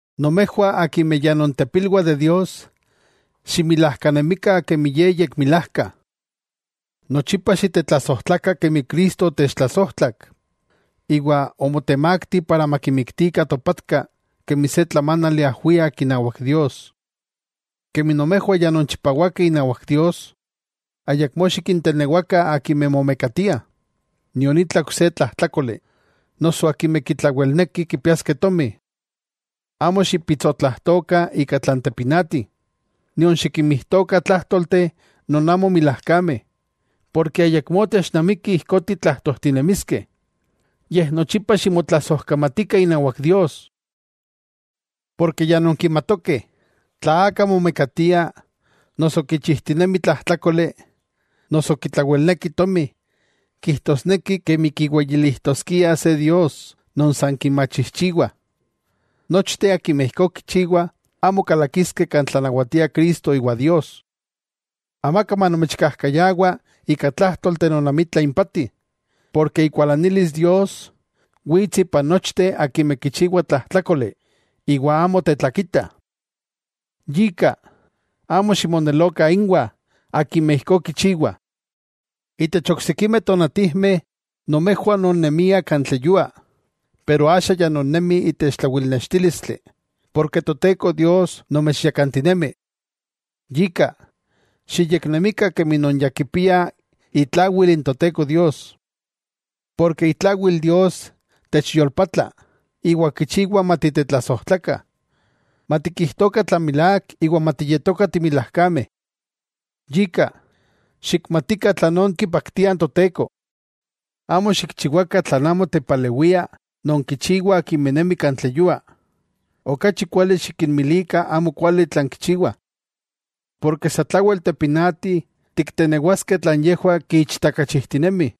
Nomejwah akimeh ya nontepilwah de Dios, ximilajkanemikah kemi Ye yekmilajka. Nochipa xitetlasojtlakah kemi Cristo otechtlasojtlak, iwa omotemakti para makimiktikah topatka kemi se tlamánali ajwiak inawak Dios. Kemi nomejwah ya nonchipawakeh inawak Dios, ayakmó xikintenewakah akimeh momekatiah, nion itla ok se tlajtlákoli, noso akimeh kitlawelneki kipiaskeh tomi. Amo xipitsotlajtokah ika tlan tepinati, nion xikinmijtokah tlájtolteh non amo milajkameh, porke ayakmó technamiki ijkó titlajtojtinemiskeh, yej nochipa ximotlasojkamatikah inawak Dios. Porke ya nonkimatokeh, tla aka momekatia, noso kichijtinemi tlajtlákoli, noso kitlawelneki tomi, kijtosneki kemi kiweyilijtoskia se “dios” non san kimachijchiwah, nochteh akimeh ijkó kichiwah, amo kalakiskeh kan tlanawatia Cristo iwa Dios. Amaka manomechkajkayawa ika tlájtolteh non amitla impati, porke ikualanilis Dios, wits ipan nochteh akimeh kichiwah tlajtlákoli, iwa amo tetlakitah. Yika, amo ximonelokah, inwah akimeh ijkó kichiwah. Itech oksikimeh tonatijmeh nomejwah ononnemiah kan tleyua, pero axa ya nonnemih itech tlawilnextílistli, porke Toteko Dios nomechyakantinemi. Yika, xiyeknemikah kemi non ya kipiah itlawil n Toteko Dios, porke itlawil Dios techyolpatla, iwa kichiwa matitetlasojtlakah, matikijtokah tlan milák iwa matiyetokah timilajkameh. Yika, xikmatikah tlanón kipaktia n Toteko. Amo xikchiwakah tlan amo tepalewia non kichiwah akimeh nemih kan tleyua, okachi kuali xikinmilikah amokuali tlan kichiwah. Porke satlawel tepinati tiktenewaskeh tlan yejwah kiichtakachijtinemih.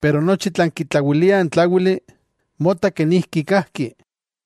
Pero nochi tlan kitlawilia n tláwili, mota kenijki kajki.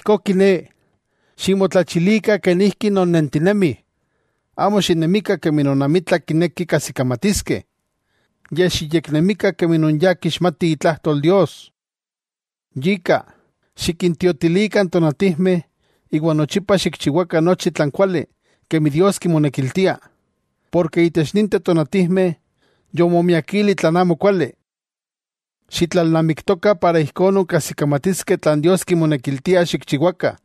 Ijkó kiné, ximotlachilikah kenijki nonnentinemih. Amo xinemikah kemi non amitla kinekih kajsikamatiskeh, yej xiyeknemikah kemi non ya kixmatih itlajtol Dios. Yika xikintiotilikah n tonatijmeh iwa nochipa xikchiwakah nochi tlan kuali kemi Dios kimonekiltia, porke itech ninteh tonatijmeh yomomiakili tlan amokuali. Xitlalnamiktokah para ijkó nonkajsikamatiskeh tlan Dios kimonekiltia xikchiwakah.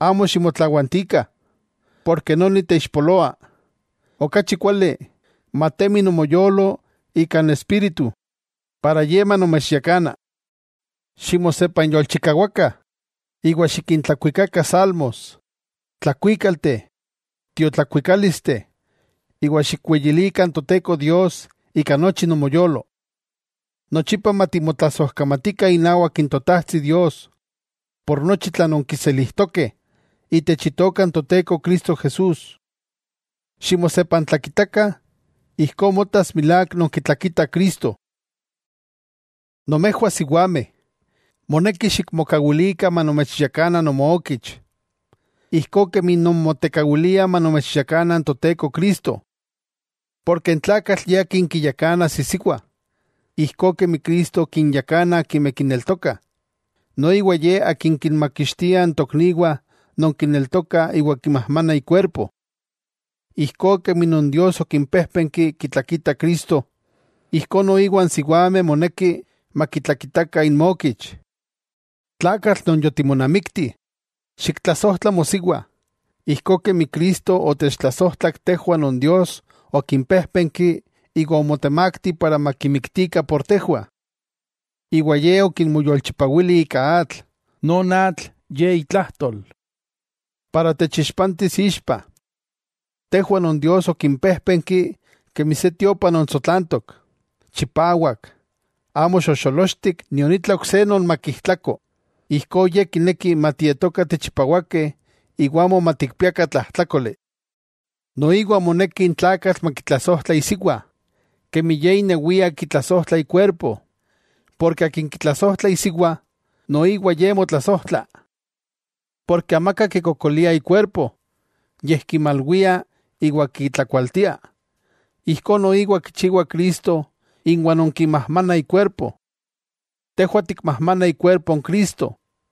Amo ximotlawantikah, porke noni teixpoloa, okachi kuali, matemi nomoyolo ika n Espíritu, para ye manomechyakana. Ximosepanyolchikawakah iwa xikintlakuikakah salmos, tlakuíkalteh, tiotlakuikálisteh, iwa xikweyilikah n Toteko Dios ika nochi nomoyolo. Nochipa matimotlasojkamatikah inawak n Totajtsi Dios por nochi tlan nonkiselijtokeh, itech Itoka n Toteko Cristo Jesús. Ximosepantlakitakah, ijkó motas milák nonkitlakitah Cristo. Nomejwah siwameh, moneki xikmokawilikah manomechyakana nomookich, ijkó kemi nonmotekawiliah manomechyakana n Toteko Cristo. Porke n tlakatl ye akin kiyakanas isiwa, ijkó kemi Cristo kinyakana akimeh kineltokah, noiwa Ye Akin kinmakixtia n tokniwah non kineltokah iwa kimajmanah ikuerpo. Ijkó kemi non Dios okimpéjpenki kitlakitah Cristo, ijkó noiwa n siwameh moneki makitlakitakah inmokich. Tlakatl non yotimonamikti, xiktlasojtla mosiwa, ijkó kemi Cristo otechtlasojtlak tejwah non Dios okimpéjpenki iwa omotemakti para makimiktikah por tejwah. Iwa Ye okinmoyolchipawili ika atl, non atl ye itlajtol, para techixpantis ixpa, tejwah non Dios okimpéjpenki kemi se tiopa non tsotlantok, chipawak amo xojxolochtik nion itla ok se non makijtlako, ijkó Ye kineki matietokah tichipawakeh iwa amo matikpiakah tlajtlákoli. Noiwa moneki n tlakatl makitlasojtla isiwa, kemi ye inewia kitlasojtla ikuerpo. Porke akin kitlasojtla isiwa, noiwa ye motlasojtla. Porke amaka kikokolia ikuerpo, yej kimalwia iwa kitlakualtia. Ijkó noiwa kichiwa Cristo inwah non kimajmanah ikuerpo. Tejwah tikmajmanah ikuerpo n Cristo.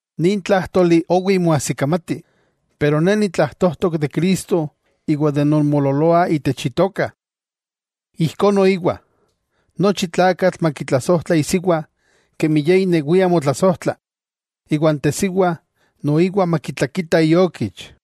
Nin tlájtoli, owi moajsikamati, pero ne nitlajtojtok de Cristo iwa de non moololoah itech Itoka. Ijkó noiwa, nochi tlakatl makitlasojtla isiwa kemi ye inewia motlasojtla, iwa n tesiwa noiwa makitlakita iokich.